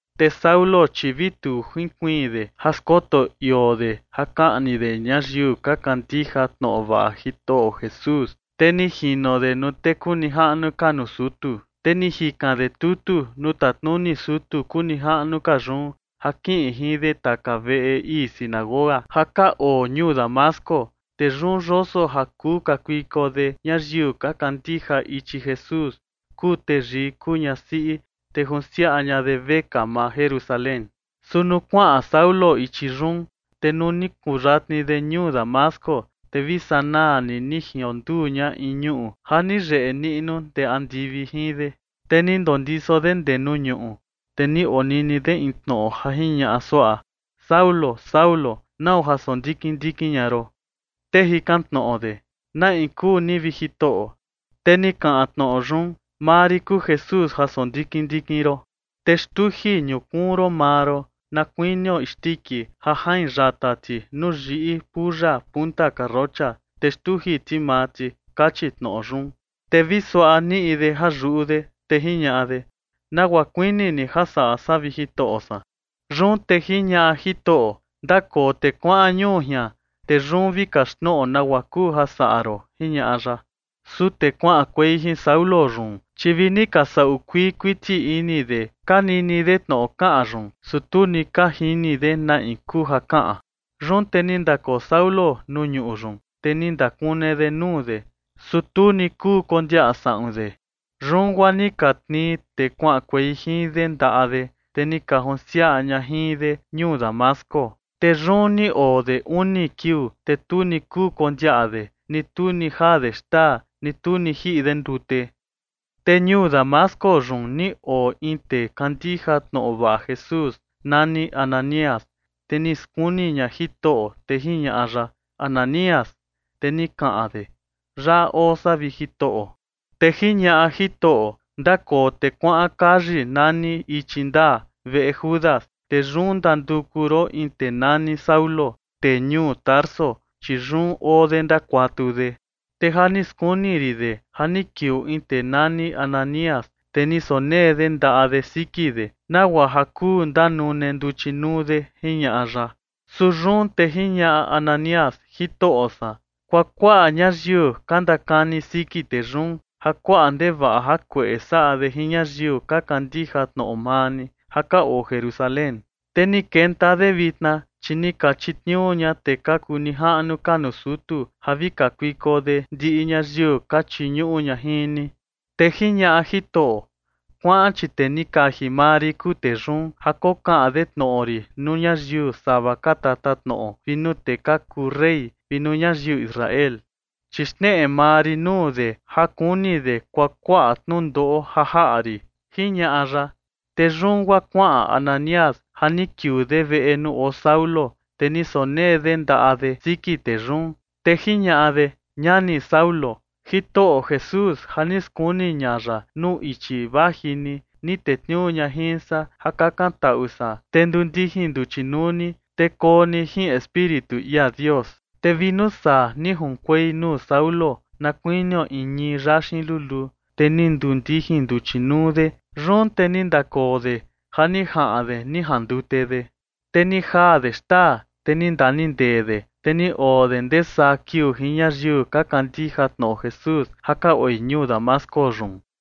Te Saulo, chi vi tu jinkuiin de ja skoto ioo de ja kaꞌni de ñayiu ka kandija tnoꞌo vaꞌa Jitoꞌo Jesús. Te ni jino de nuu tee kuu nijaꞌnu ka nuu sutu, te ni jikan de tutu nuu tatnuni sutu kuu nijaꞌnu ka yun ja kiꞌin jin de taka veꞌe ii sinagoga ja ka oo ñuu Damasco. Te yun yoso ja kuu kakuiko de ñayiu ka kandija ichi Jesús, kuu teyii kuu ñasiꞌi, te junsiaꞌa ña de vekaa maa Jerusalén. Su nuu kuaꞌan Saulo ichi yun, te nuu ni kuyatni de ñuu Damasco, te vi sanaa ni ni jionduu ña in ñuꞌu ja ni yeꞌe niꞌnu ndee andivi jin de. Te ni ndondiso de ndee nuu ñuꞌu, te ni onini de in tnoꞌo ja jiñaꞌa suaꞌa: ―Saulo, Saulo, ¿nau ja sondikin ndikin ña ron? Te jikan tnoꞌo de: ―¿Na in kuu ni, vi Jitoꞌo? Te ni kaꞌan tnoꞌo yun: ―Maa rin kuu Jesús ja sondikin ndikin ron. Te xtuji ñukuun ron maa ron na kuinio isndiki ja jain yata ti nuu yiꞌi puya punta karrocha, te xtuji ti maa ti ―kachi tnoꞌo yun. Te vi suaꞌa niꞌi de ja yuꞌu de, te jiñaꞌa de: ―¿Nagua kuini ni ja saꞌa san, vi Jitoꞌo san? Yun te jiñaꞌa Jitoꞌo: ―Ndakoo te kuaꞌan ñuu jian, te yun vi kaxtnoꞌo nagua kuu ja saꞌa ron ―jiñaꞌa ya. Su tee kuaꞌankuei jin Saulo yun, chi vi ni ka saꞌu kuii kuiti ini de ka nini de tnoꞌo kaꞌan yun, su tu ni ka jini de na in kuu ja kaꞌan. Yun te ni ndakoo Saulo nuu ñuꞌu yun, te ni ndakune de nuu de, su tu ni kuu kondiaꞌa saꞌun de. Yun guaa ni ka tnii tee kuaꞌankuei jin de ndaꞌa de, te ni ka junsiaꞌa ña jin de ñuu Damasco. Te yun ni oo de uni kiuu. Te tu ni kuu kondiaꞌa de, ni tu ni jaa de xtaa, ni tu ni jiꞌi de ndute. Te ñuu Damasco yun ni oo in tee kandija tnoꞌo vaꞌa Jesús nani Ananías. Te ni skuni ña Jitoꞌo, te jiñaꞌa ya: ―Ananías. Te ni kaꞌan de: ―Yaꞌa oo san, vi Jitoꞌo. Te jiñaꞌa Jitoꞌo: ―Ndakoo te kuaꞌan kayi nani Ichi Ndaa, veꞌe Judas, te yun ndanduku ron in tee nani Saulo, tee ñuu Tarso, chi yun oo de ndakuatu de. Te ja ni skuni rin de ja ni kiuu in tee nani Ananías, te ni sonee de ndaꞌa de siki de, nagua ja kuu ndanune nduchi nuu de ―jiñaꞌa ya. Su yun te jiñaꞌa Ananías: ―Jitoꞌo san, kuakuaꞌa ñayiu ka ndakani siki tee yun, ja kuaꞌa ndevaꞌa jakueꞌe saꞌa de jin ñayiu ka kandija tnoꞌo maa ni ja ka oo Jerusalén. Te ni kenta de vitna, chi ni ka chitniuu ña tee ka kuu nijaꞌnu ka nuu sutu ja vi kakuiko de ndiꞌi ñayiu ka chiñuꞌu ña jin ni. Te jiñaꞌa Jitoꞌo: ―Kuaꞌan, chi tee ni kaji maa rin kuu tee yun ja kokaꞌan de tnoꞌo rin nuu ñayiu sava ka tatatnoꞌo vi nuu tee ka kuu rey vi nuu ñayiu Israel. Chi xneꞌe maa rin nuu de ja kuni de kuakuaꞌa tnundoꞌo ja jaꞌa rin ―jiñaꞌa ya. Te yun guaa kuaꞌan Ananías ja ni kiuu de veꞌe nuu oo Saulo. Te ni sonee de ndaꞌa de siki tee yun, te jiñaꞌa de: ―Ñani Saulo, Jitoꞌo Jesús ja ni skuni ña ya nuu ichi vaji ni, ni tetniuu ña jin san ja kakantaꞌu san, te nduu ndijin nduchi nuu ni, te koo ni jin Espíritu ia Dios. Te vi nuu saa ni junkuei nuu Saulo na kuinio in ñii yaxin luluu, te ni nduu ndijin nduchi nuu de. Yun te ni ndakoo de ja ni jaꞌan de ni jandute de. Te ni jaa de xtaa, te ni ndaniꞌi ndee de. Te ni oo de ndee saa kiuu jin ñayiu ka kandija tnoꞌo Jesús ja ka oi ñuu Damasco yun.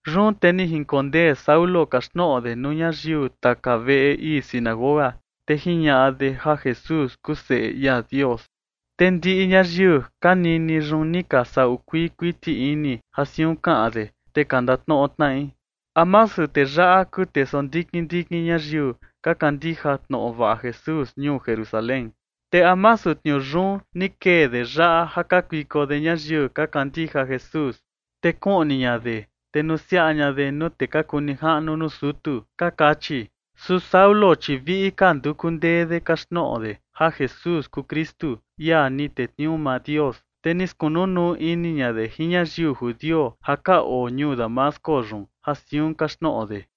Yun te ni jinkondee Saulo kaxtnoꞌo de nuu ñayiu taka veꞌe ii sinagoga, te jiñaꞌa de ja Jesús kuu Seꞌe ia Dios. Te ndiꞌi ñayiu ka nini yun ni ka saꞌu kuii kuiti ini ja siun kaꞌan de, te ka ndatnoꞌo tnaꞌi: ―¿A masu tee yaꞌa kuu tee sondikin ndikin ñayiu ka kandija tnoꞌo vaꞌa Jesús ñuu Jerusalén? Te ¿a masu tniuu yun ni kee de yaꞌa ja kakuiko de ñayiu ka kandija Jesús, te kuꞌni ña de, te nusiaꞌa ña de nuu tee ka kuu nijaꞌnu nuu sutu? ―ka kachi. Su Saulo, chi viꞌi ka nduku ndee de kaxtnoꞌo de ja Jesús kuu Kristu, ia ni tetniuu maa Dios. Te ni skunu nuu ini ña de jin ñayiu judio ja ka oo ñuu Damasco yun ja siun kaxtnoꞌo de.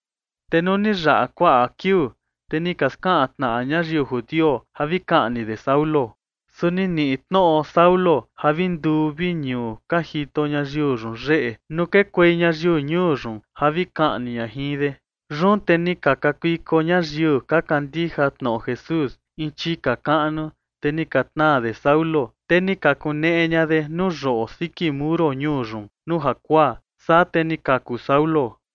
Te nuu ni yaꞌa kuaꞌa kiuu, te ni ka skaꞌan tnaꞌa ñayiu judio ja vi kaꞌni de Saulo. Su ni niꞌi tnoꞌo Saulo ja vi nduu vi ñuu ka jito ñayiu yun yeꞌe nuu kekuei ñayiu ñuu yun ja vi kaꞌni ña jin de. Yun te ni ka kakuiko ñayiu ka kandija tnoꞌo Jesús in chika kaꞌnu, te ni ka tnaa de Saulo, te ni ka kuneꞌe ña de nuu yoꞌo siki muro ñuu yun nuu jakuaa, saa te ni kaku Saulo.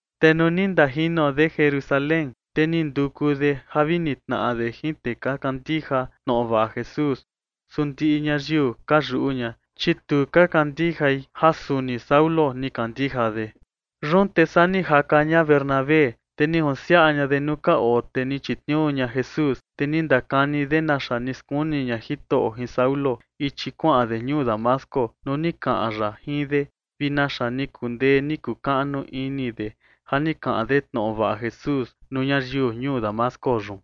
Te nuu ni ndajino de Jerusalén, te ni nduku de ja vi nitnaꞌa de jin tee ka kandija tnoꞌo vaꞌa Jesús. Su ndiꞌi ñayiu ka yuꞌu ña, chi tu ka kandijai ja suni Saulo ni kandija de. Yun te saa ni jaka ña Bernabé, te ni junsiaꞌa ña de nuu ka oo tee ni chitniuu ña Jesús, te ni ndakani de naxa ni skuni ña Jitoꞌo jin Saulo ichi kuaꞌan de ñuu Damasco nuu ni kaꞌan ya jin de, vi naxa ni kundee ni kukaꞌnu ini de ja ni kaꞌan de tnoꞌo vaꞌa Jesús nuu ñayiu ñuu Damasco yun.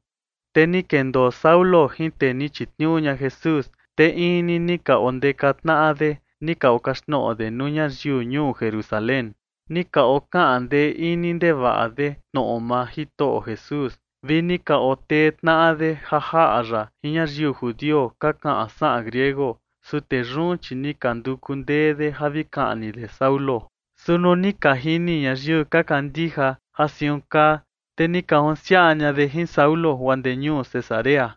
Te ni kendoo Saulo jin tee ni chitniuu ña Jesús, te in ni ni ka ondeka tnaꞌa de ni ka okaxtnoꞌo de nuu ñayiu ñuu Jerusalén. Ni ka okaꞌan ndee ini ndevaꞌa de tnoꞌo maa Jitoꞌo Jesús, vi ni ka otee tnaꞌa de ja jaꞌa ya jin ñayiu judio ka kaꞌan saꞌan griego, su tee yun, chi ni ka nduku ndee de ja vi kaꞌni de Saulo. Su nuu ni ka jini ñayiu ka kandija ja siun kaa, te ni ka junsiaꞌa ña de jin Saulo guaa ndee ñuu Cesarea.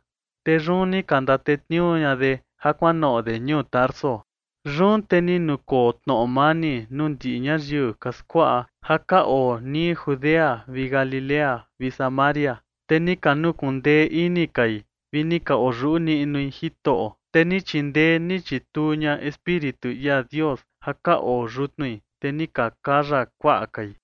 Te yun ni ka ndatetniuu ña de ja kuanoꞌo de ñuu Tarso. Yun te ni nukoo tnoꞌo mani nuu ndiꞌi ñayiu ka skuaꞌa ja ka oo nii Judea vi Galilea vi Samaria. Te ni ka nukundee ini kai, vi ni ka oyuꞌu niꞌnui Jitoꞌo, te ni chindee ni chituu ña Espíritu ia Dios ja ka oo yutnui, te ni ka kaya kuaꞌa kai.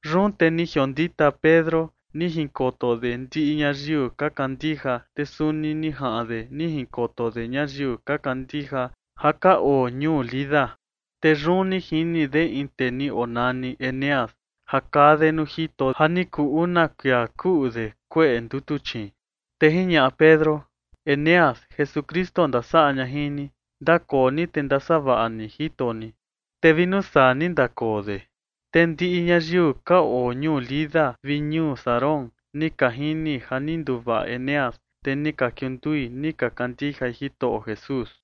Yun te ni jiondita Pedro ni jinkoto de ndiꞌi ñayiu ka kandija, te suni ni jaꞌan de ni jinkoto de ñayiu ka kandija ja ka oo ñuu Lida. Te yun ni jini de in tee ni onani Eneas ja kaa de nuu jito ja ni kuu una kuia kuꞌu de kueꞌe ndutuchiin. Te jiñaꞌa Pedro: ―Eneas, Jesukristu ndasaꞌa ña jin ni. Ndakoo ni te ndasavaꞌa ni jito ni. Te vi nuu saa ni ndakoo de. Te ndiꞌi ñayiu ka oo ñuu Lida vi ñuu Sarón ni ka jini ja ni nduvaꞌa Eneas, te ni ka kiundui ni ka kandijai Jitoꞌo Jesús.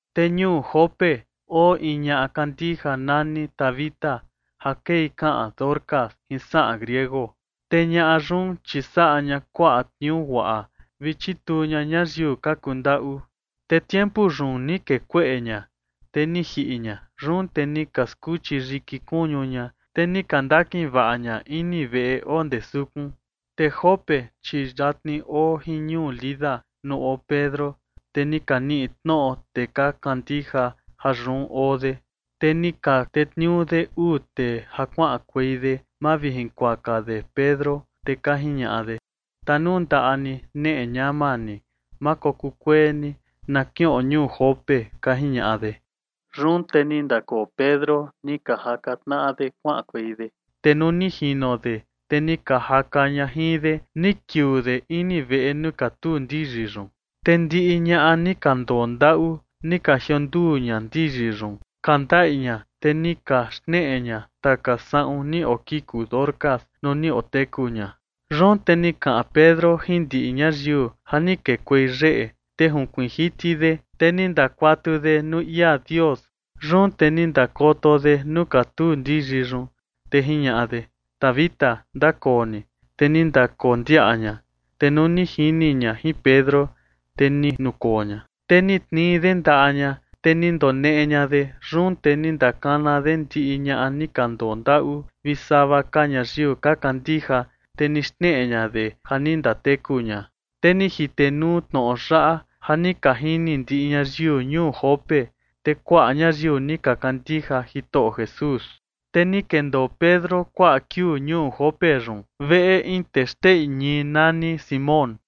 Te ñuu Jope oo in ñaꞌa kandija nani Tabita, ja kei kaꞌan Dorcas jin saꞌan griego. Te ñaꞌa yun, chi saꞌa ña kuaꞌa tniuu guaꞌa vi chituu ña ñayiu ka kundaꞌu. Te tiempu yun ni kee kueꞌe ña, te ni jiꞌi ña. Yun te ni ka skuchi yiki kuñu ña, te ni ka ndakin vaꞌa ña ini veꞌe oo ndee sukun. Te Jope, chi yatni oo jin ñuu Lida nuu oo Pedro, te ni ka niꞌi tnoꞌo tee ka kandija ja yun oo de, te ni ka tetniuu de uu tee ja kuaꞌankuei de mavijunkuaka de Pedro, te ka jiñaꞌa de: ―Tanundaꞌa ni, neꞌe ñama ni, ma kokuu kuee ni na kiꞌon ñuu Jope ―ka jiñaꞌa de. Yun te ni ndakoo Pedro, ni ka jaka tnaꞌa de kuaꞌankuei de. Te nuu ni jino de, te ni ka jaka ña jin de, ni kiuu de ini veꞌe nuu katuu ndiyi yun. Te ndiꞌi ñaꞌa ni ka ndondaꞌu ni ka jionduu ña ndiyi yun ka ndaꞌi ña, te ni ka xneꞌe ña taka saꞌun ni okiku Dorcas nuu ni oteku ña. Yun te ni kaꞌan Pedro jin ndiꞌi ñayiu ja ni kekuei yeꞌe, te junkuiin jiti de, te ni ndakuatu de nuu ia Dios. Yun te ni ndakoto de nuu katuu ndiyi yun, te jiñaꞌa de: ―Tabita, ndakoo ni. Te ni ndakondiaꞌa ña, te nuu ni jini ña jin Pedro, te ni nukoo ña. Te ni tnii de ndaꞌa ña, te ni ndoneꞌe ña de. Yun te ni ndakana de ndiꞌi ñaꞌa ni ka ndondaꞌu vi sava ka ñayiu ka kandija, te ni xneꞌe ña de ja ni ndateku ña. Te ni jitenuu tnoꞌo yaꞌa ja ni ka jini ndiꞌi ñayiu ñuu Jope. Te kuaꞌa ñayiu ni ka kandija Jitoꞌo Jesús. Te ni kendoo Pedro kuaꞌa kiuu ñuu Jope yun, veꞌe in tee xteꞌi ñii nani Simón.